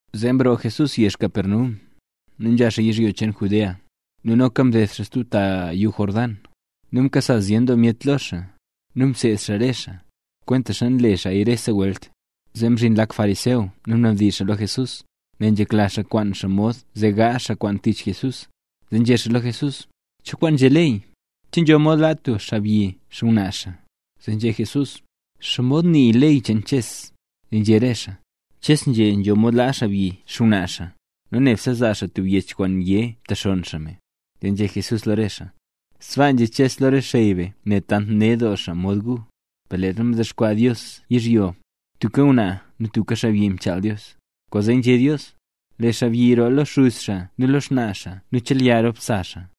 Zee mroo Jesús yezh Capernaum, nu nzha xaa yizhyo cheen Judea, nu noka mded xaa stub ta yuu Jordán. Nu mkasa zyen doo myet lo xaa, nu mseed xaa re xaa, kwentaxa nle xaaya rese welt. Zee mzhin lak fariseo nu mnadizh xaa lo Jesús, nel nzhekla xaa kwaan xaa mod zee gaazh xaa kwaan tich Jesús, zee nzhé xaa lo Jesús: —¿Cho kwaan nzhé ley? ¿Che nzho mod laa tub xaabyi xngwnaa xaa? Zee nzhé Jesús: —¿Xomod nii ley cheen Ches? Zee nzhé re xaa: —Ches nzhé nzho mod laa xaabyi xngwnaa xaa, nu nebse zaa xaa tub yech kwaan yé mtexonn xaa me. Zee nzhé Jesús lo re xaa: —Sbaa nzhé Ches lo re xey be nel tant ned doo xaa mod gu. Per leezha mdexkwaa Dios yizhyo, tubka ngwnaa nu tubka xaabyi mchaal Dios. Kwaanzee nzhé Dios: “Lee xaabyi roo lo xuz xaa nu lo xnaa xaa nu chelya rop sa xaa,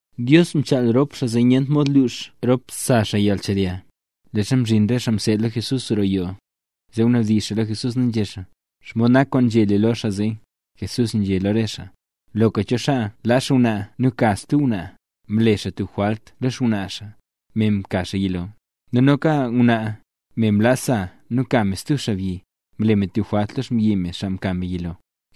Dios mchaal rop xaa, zee nyent mod lux rop sa xaa yalnchelya. Leezha mzhin re xaa mseed lo Jesús roo yoo, zee mnabdizh xaa lo Jesús nu nzhé xaa: —¿Xomod nak kwaan nzhé lu lo xaa zee? Jesús nzhé lo re xaa: —Loka cho xaa laa xngwnaa nu ka xaa stub ngwnaa, mle xaa tub jwalt lo xngwnaa xaa, me mka xaa yilo. Nu noka ngwnaa, me laa sa nu ka me stub xaabyi, mle me tub jwalt lo xmbyi me, xaa mka me yilo.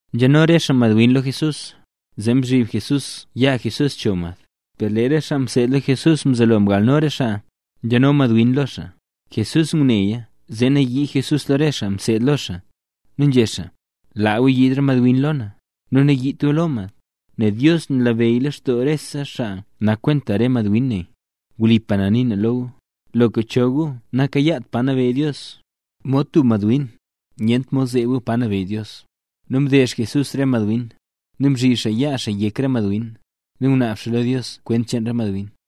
Nzhano xaa re madwin lo Jesús, zee zhiib Jesús yaa Jesús cho mad. Per lee re xaa mseed lo Jesús mzelo mgalno re xaa nzhano madwin lo xaa. Jesús nguneya zee nayii Jesús lo re xaa mseed lo xaa, nu nzhé Jesús: —Laa gu yiid re madwin lo na, nu nayiit gu lo mad. Nel Dios nabeyy leen lextoo re xaa nak kwenta re madwin ne. Wlipa na nii na lo gu, loka cho gu nakayaat pa nabeyy Dios, mod tub madwin, nyent mod zeeb gu pa nabeyy Dios. Nu mdeezh Jesús re madwin, nu mzhib xaa yaa xaa yek re madwin, nu ngunaab xaa lo Dios kwent cheen re madwin.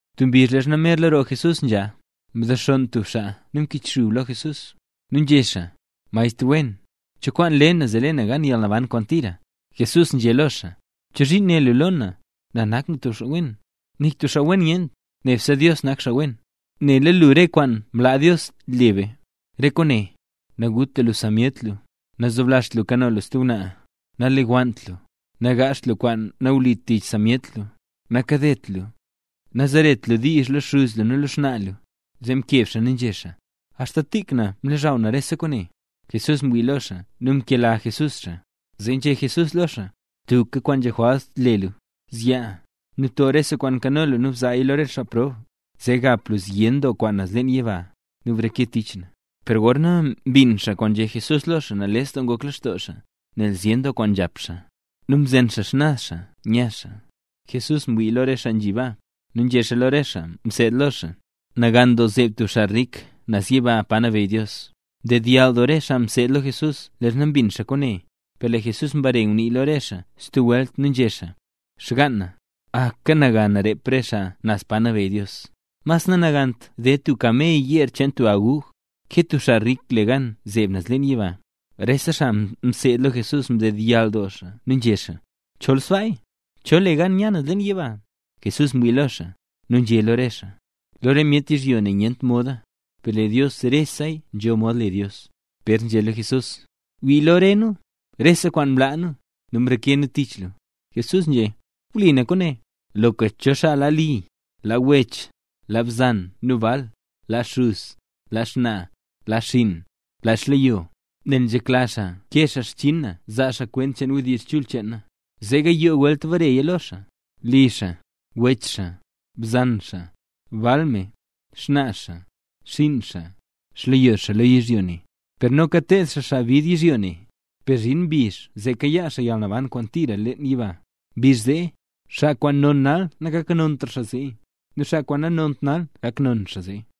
Tub mbizh leezha merla roo Jesús nzha, mzexonn tub xaa nu mkichxub lo Jesús, nu nzhé xaa: —Maestr wen. ¿Cho kwaan le na zee le na gan yalnaban kwaan tira? Jesús nzhé lo xaa: —¿Chozhiin né lu lo na, na nak tub xaa wen? Nik tub xaa wen nyent, nebse Dios nak xaa wen. Nela lu re kwaan mlaa Dios le be. Re kwaane: naguta lu sa myet lu, nazoblazht lu kano lu stub ngwnaa, nalewannt lu, nagaazht lu tub kwaan nawlit tich sa myet lu, nakadet lu, nu nazeret lu diizh lo xuz lu nu lo xnaa lu. Zee mkeb xaa nu nzhé: —Axta tik na mlozhaw na rese kwaane. Jesús mwii lo xaa nu mkela Jesús xaa. Zee nzhé Jesús lo xaa: —Tubka kwaan nzho jwalt le lu. Zyaa, nu bto rese kwaan nkano lu nu bzaaya lo re xaa prob, zee gap lu zyen doo kwaan naz leen yiba, nu breke tich na. Per gorna mbin xaa kwaan nzhé Jesús lo xaa, nales doo ngok lextoo xaa, nel zyen doo kwaan nzhap xaa. Nu mzen xaa xnaz xaa nya xaa. Jesús mwii lo re xaa nzhi baa, nu nzhé xaa lo re xaa mseed lo xaa: —Nagan doo zeeb tub xaa rik naz yiba, pa nabeyy Dios. Ndedyall doo re xaa mseed lo Jesús leezha mbin xaa kwaane. Per lee Jesús mbare ngunii lo re xaa stub welt nu nzhé xaa: —Xgaan na, aka nagan rep re xaa naz pa nabeyy Dios. Mas nanagant ded tub kamey yeer cheen tub aguj, ke tub xaa rik le gan zeeb naz leen yiba. Rese xaa mseed lo Jesús mdedyall doo xaa nu nzhé xaa: —Chol sbaaya, ¿cho le gan nya naz leen yiba? Jesús mwii lo re xaa, nu nzhé lo re xaa: —Lo re myet yizhyo ne nyent moda, per lee Dios reseya nzho mod le Dios. Pér nzhé lo Jesús: —Wii lo rese nu, rese kwaan mlaa nu, nu mreke nu tich lu. Jesús nzhé: —Wlipa na kwaane, loka cho xaa laa li, laa wech, laa bzan nu bal, laa xuz, laa xnaa, laa xinn, laa xleyo, nel nzhekla xaa kee xaa xchinn na, zaa xaa kwent cheen wdizh chul cheen na, zee gayoo welt bareya lo xaa: li xaa, wech xaa, bzan xaa, bal me, xnaa xaa, xinn xaa, xleyo xaa lo yizhyo ne, per noka ted xaa xaa bid yizhyo ne. Per zhin mbizh zee kayaa xaa yalnaban kwaan tira leen yiba. Mbizh zee, xaa kwaan non nal nagaknontra xaa zee; nu xaa kwaan nanont nal gak non zee.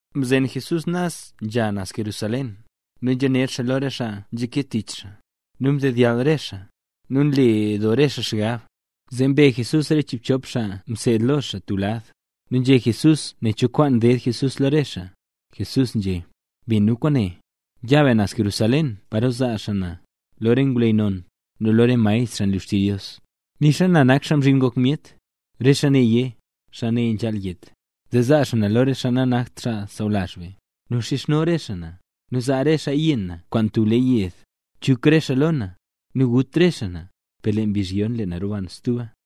Mzen Jesús naz nzha xaa naz Jerusalén, nu nzhaner xaa lo re xaa nzhake tich xaa. Nu mdedyall re xaa, nu nle doo re xaa xgab. Zee mbe Jesús re chiibchop xaa mseed lo xaa tub lad, nu nzhé Jesús nen cho kwaan ded Jesús lo re xaa. Jesús nzhé: —Bin gu kwaane. Ya be naz Jerusalén paro zaa xaa na lo re ngwleyy non, nu lo re maestr, xaa nlu xtizh Dios; nixa na nak Xaa Mzhin Ngok Myet. Re xaa ne yé: “Xaa ne nzhaal yet”. Zee zaa xaa na lo xaa nanakt xaa sawlazh be. Nu xizhno re xaa na, nu zaa re xaaya yenn na kwaan tub le yed, chuk re xaa lo na, nu gut re xaa na. Per lee mbizh yon, lee na roban stuba.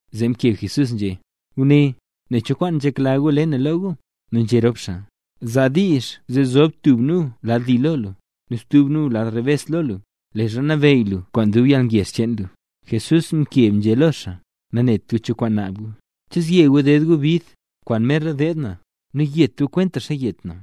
Zee mkeb Jesús nzhé: —Guné, nen cho kwaan nzhekla gu le na lo gu. Nu nzhé rop xaa: —Zaa diizh zee zob tub nu lad li lo lu, nu stub nu zob lad rebes lo lu, leezha nabeyy lu kwaan dub yalngezh cheen lu. Jesús mkeb nzhé lo xaa: —Nanet gu cho kwaan naab gu. ¿Che zye gu ded gu bid, kwaan merla deed na, nu yet gu kwentaxa yet na?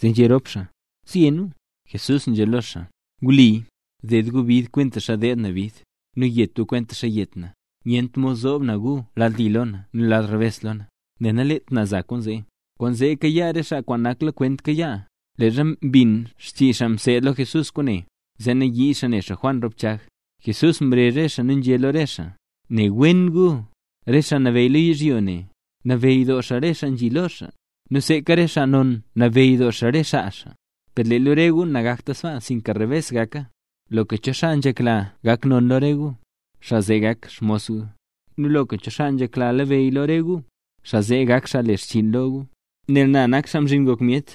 Zee nzhé rop xaa: —Zye nu. Jesús nzhé lo xaa: —Wli, ded gu bid kwentaxa deed na bid, nu yet gu, kwentaxa yet na. Nyent mod zoob na gu lad li lo na nu lad rebes lo na, nel naleet na za kwaan zee. Kwaan zee kayaa re xaa naklakwent kayaa. Leezha mbin xchii xaa mseed lo Jesús kwaane, zee nayii xaa ne xaa Juan rop Chag. Jesús mrezh re xaa nu nzhé lo re xaa: —Ne wen gu, re xaa nabeyy yizhyo ne, nabeyy doo xaa re xaa nzhi lo xaa, nu seeka re xaa non nabeyy doo xaa re xaa xaa. Per lee lo re gu nagakta sbaa, sinka rebes gaka. Loka cho xaa nzhekla gak non lo re gu, xaa zee gak xmos gu. Nu loka cho xaa nzhekla nabeyy lo re gu, xaa zee gak xaa le xchiin lo gu. Nel na nak Xaa Mzhin Ngok Myet,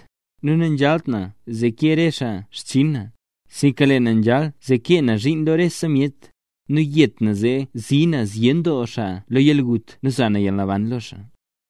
nu nanzhalt na zee kee re xaa xchinn na, sinka lee na nzhal zee kee na zhiin lo rese myet, nu yet na zee zii na zyen doo xaa lo yalgut nu za na yalnaban lo xaa.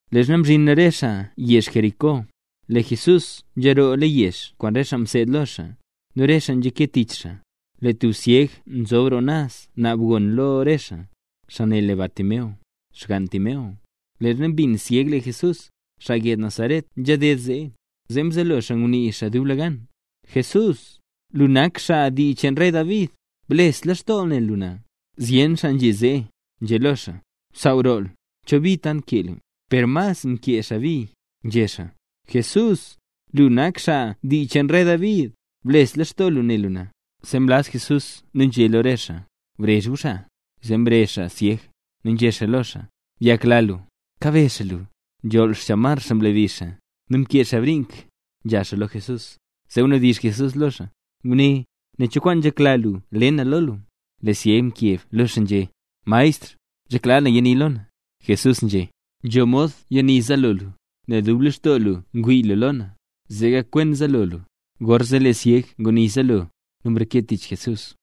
Leezha mzhin re xaa yezh Jericó, lee Jesús nzharoola leen yezh kwaan re xaa mseed lo xaa, nu re xaa nzha ke tich xaa. Lee tub syeg nzob roo naz naab gon lo re xaa. Xaa ne le Bartimeo, xgann Timeo. Leezha mbin syeg lee Jesús, xaa yezh Nazaret nzhaded zee, zee mzelo xaa ngunii xaa dublegan: —Jesús, lu nak xaa dii cheen rey David, bles lextoo lu ne lu na. Zyen xaa nzhi zee, nzhé lo xaa: —¡Saaw roo lu! ¿Cho bi tant kee lu? Per mas nkee xaa bi, nzhé xaa: —Jesús, lu nak xaa dii cheen rey David, bles lextoo lu ne lu na. Zee mlaz Jesús nu nzhé lo re xaa: —Brezh gu xaa. Zee mrezh xaa syeg, nu nzhé xaa lo xaa: —Byakla lu; kabezh xaa lu. Nzholl xchamar xaa mlabi xaa, nu mkee xaa brink, nzha xaa lo Jesús. Zee mnabdizh Jesús lo xaa: —Guné, nen cho kwaan nzhekla lu le na lo lu. Lee syeg mkeb lo xaa nzhé: —Maestr, nzhekla na yani lo na. Jesús nzhé: —Nzho mod yani zaalo lu, nel dub lextoo lu ngwii lu lo na, zee gakwen zaalo lu. Gorzee lee syeg nguni zaalo, nu mreke tich Jesús.